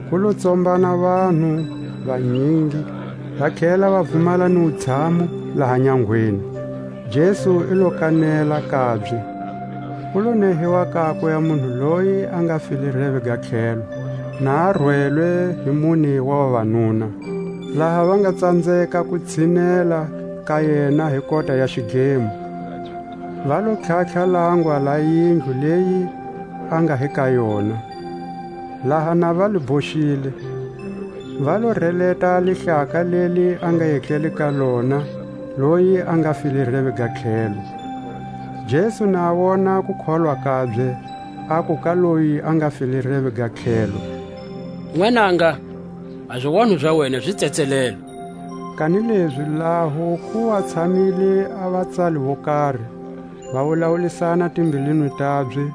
Ku lo tsombana vanhu vanyingi, va tlhela va vumala ni wutshamu laha nyangweni; Jesu i lo kanela kabye. Ku lo nehiwa kakwe a munhu loyi a nga file reve ga tlhelo, na a rwelwe hi mune wa vavanuna. Laha va nga tsanzeka ku tshinela ka yena hi kota ya xidlemo, va lo tlhatlha a langwa la yindlu leyi a nga hi ka yona; laha na va li hoxile, va lo releta a lihlaka leli a nga etlele ka lona loyi a nga file reve ga tlhelo. Jesu na a wona a kukholwa kabye, aku ka loyi a nga file reve ga tlhelo, Nwananga, a zionho za wena zi tsetselelwe. Kanilezi laho ku wa tshamile a vatsali vo kari, va wulawulisana timbilwini tabye,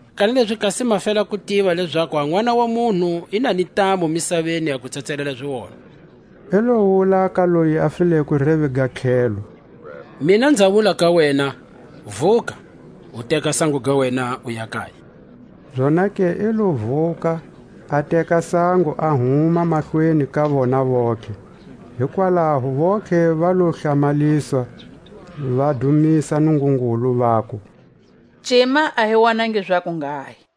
Kanilezi kasi ma fela ku zi tiva lezaku a Nʼwana wa munhu i na ni ntamu misaveni a ku tsetselela zionho (i lo wula ka loyi a fileko reve ga tlhelo): Mina nza wula ka wena, Vuka, u teka sango ga wena uya kaya. Zonake i lo vuka, a teka sango a huma mahlweni ka vona vontlhe; hikwalaho vontlhe va lo hlamaliswa, va dumisa Nungungulu, vaku: Cima a hi wonangi zakunghahi. A kuoitanwa ka Levi.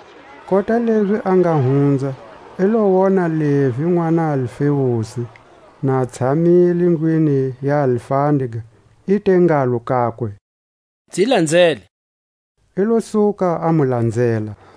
Kota lezi a nga hunza, i lo wona Levi nʼwana Alfeusi, na a tshamile ndlwini ya alfandega; i te ngalo kakwe: Nzi lanzele. I lo suka a mu lanzela.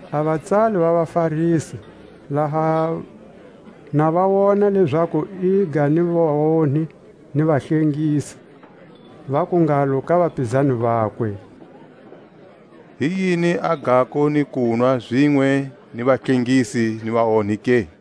A vatsali va vaFarisi, laha na va wona lezaku iga ni vaonhi ni vahlengisi, vaku ngalo ka vapizani vakwe: Hi yini a gako ni kunwa zinwe ni vahlengisi ni vaonhi ke?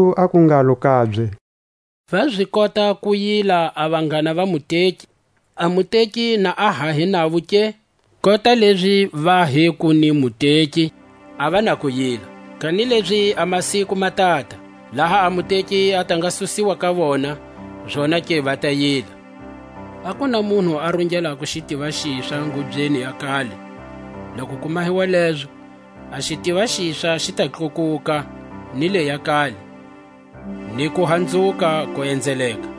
Jesu aku ngalo kabye: Va zi kota ku yila a vanghana va muteki, a muteki na a ha hi navo ke? Kota lezi va hi ku ni muteki a va na ku yila. Kanilezi a masiku ma tata, laha a muteki a ta nga susiwa ka vona, zonake va ta yila. A ku na munhu a rungelako xitiva xiswa ngubyeni ya kale; loku ku mahiwa lezo, a xitiva xiswa xi ta tlakuka ni leʼya kale, ni kuhanzuka ku enzeleka.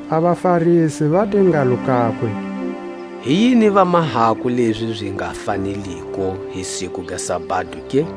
A vaFarisi va te ngalo kakwe: Hi yini va mahako lezi zi nga faneliko hi siku ga sabado ke?